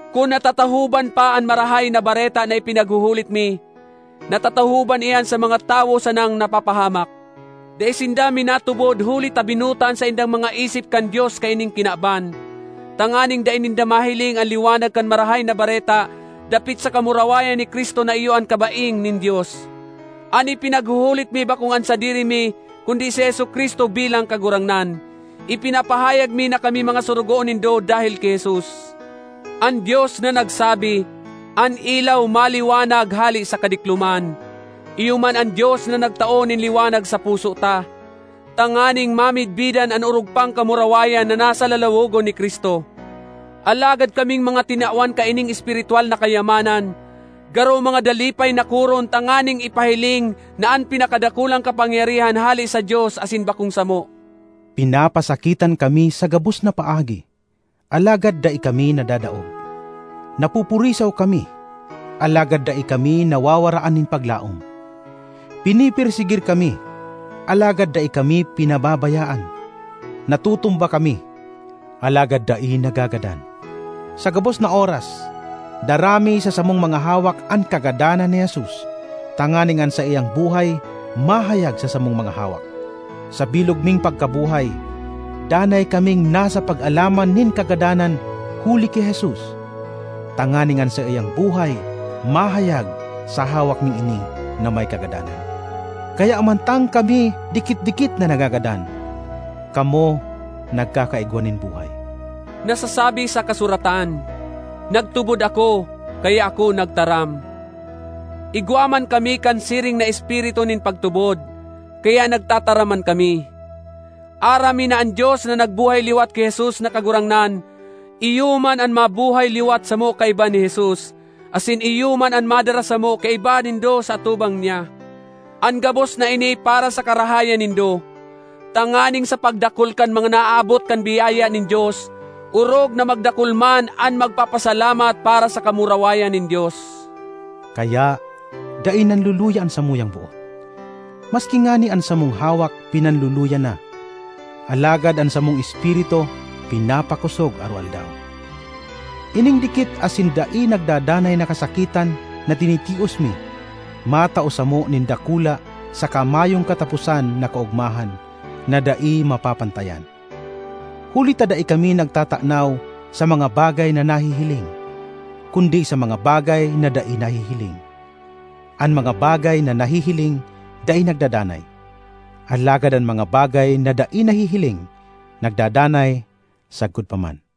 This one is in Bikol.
Kun natatahoban pa an Marahay na Bareta na ipinaghuhulit mi, natatahoban iyan sa mga tawo sanang napapahamak. Dai sinda minatubod huli ta binuta an saindang mga isip kan dios kaining kinaban, tanganing dai ninda mahiling an liwanag kan Marahay na Bareta dapit sa kamurawayan ni Cristo na iyo an kabaing nin Dios. An ipinaghuhulit mi bakong an sadiri mi kundi si Jesu-Cristo bilang Kagurangnan; ipinapahayag mi na kami mga sorogoon nindo dahel ki Jesus. An Dios na nagsabi, “An ilaw maliwanag hale sa kadikloman!” Iyo man an Dios na nagtao nin liwanag sa puso ta, tanganing mamidbidan an orog pang kamurawayan na nasa lalawogon ni Cristo. Alagad kaming mga tinawan kaining espiritwal na kayamanan garo mga dalipay na koron tanganing ipahiling na an pinakadakulang kapangyarihan hale sa Dios asin bakong samo. Pinapasakitan kami sa gabos na paagi, alagad dai kami nadadaog; napupurisaw kami, alagad dai kami nawawaraan nin paglaom. Pinepersegir kami alagad dai kami pinababayaan; natutumba kami, alagad dai nagagadan. Sa gabos na oras dara mi sa samong mga hawak an kagadanan ni Jesus tanganing an saiyang buhay mahayag sa samong mga hawak. Sa bilog ming pagkabuhay, danay kaming nasa pag-alaman nin kagadanan huli ki Jesus, tanganing an saiyang buhay mahayag sa hawak ming ini na may kagadanan. Kaya mantang kami dikit-dikit na nagagadan, kamo nagkakaigwa nin buhay. Nasasabi sa kasuratan, “Nagtubod ako, kaya ako nagtaram.” Igwa man kami kan siring na espiritu nin pagtubod, kaya nagtataram man kami. Aram mi na an Dios na nagbuhay liwat ki Jesus na Kagurangnan iyo man an mabuhay liwat samo kaiba ni Jesus, asin iyo man an madara samo kaiba nindo sa atubangan niya. An gabos na ini para sa karahayan nindo, tanganing sa pagdakul kan mga naaabot kan biyaya nin Dios, orog na magdakul man an magpapasalamat para sa kamurawayan nin Dios. Kaya dai nanluluya an samuyang boot. Maski ngani an samong hawak pinanluluya na, alagad an samong espiritu pinapakosog aroaldaw. Ining dikit asin dai nagdadanay na kasakitan na tinitios mi matao samo nin dakula saka mayong kataposan na kaogmahan na dai mapapantayan. Huli ta dai kami nagtatanaw sa mga bagay na nahihiling, kundi sa mga bagay na dai nahihiling. An mga bagay na nahihiling dai nagdadanay, alagad an mga bagay na dai nahihiling nagdadanay sagkod pa man.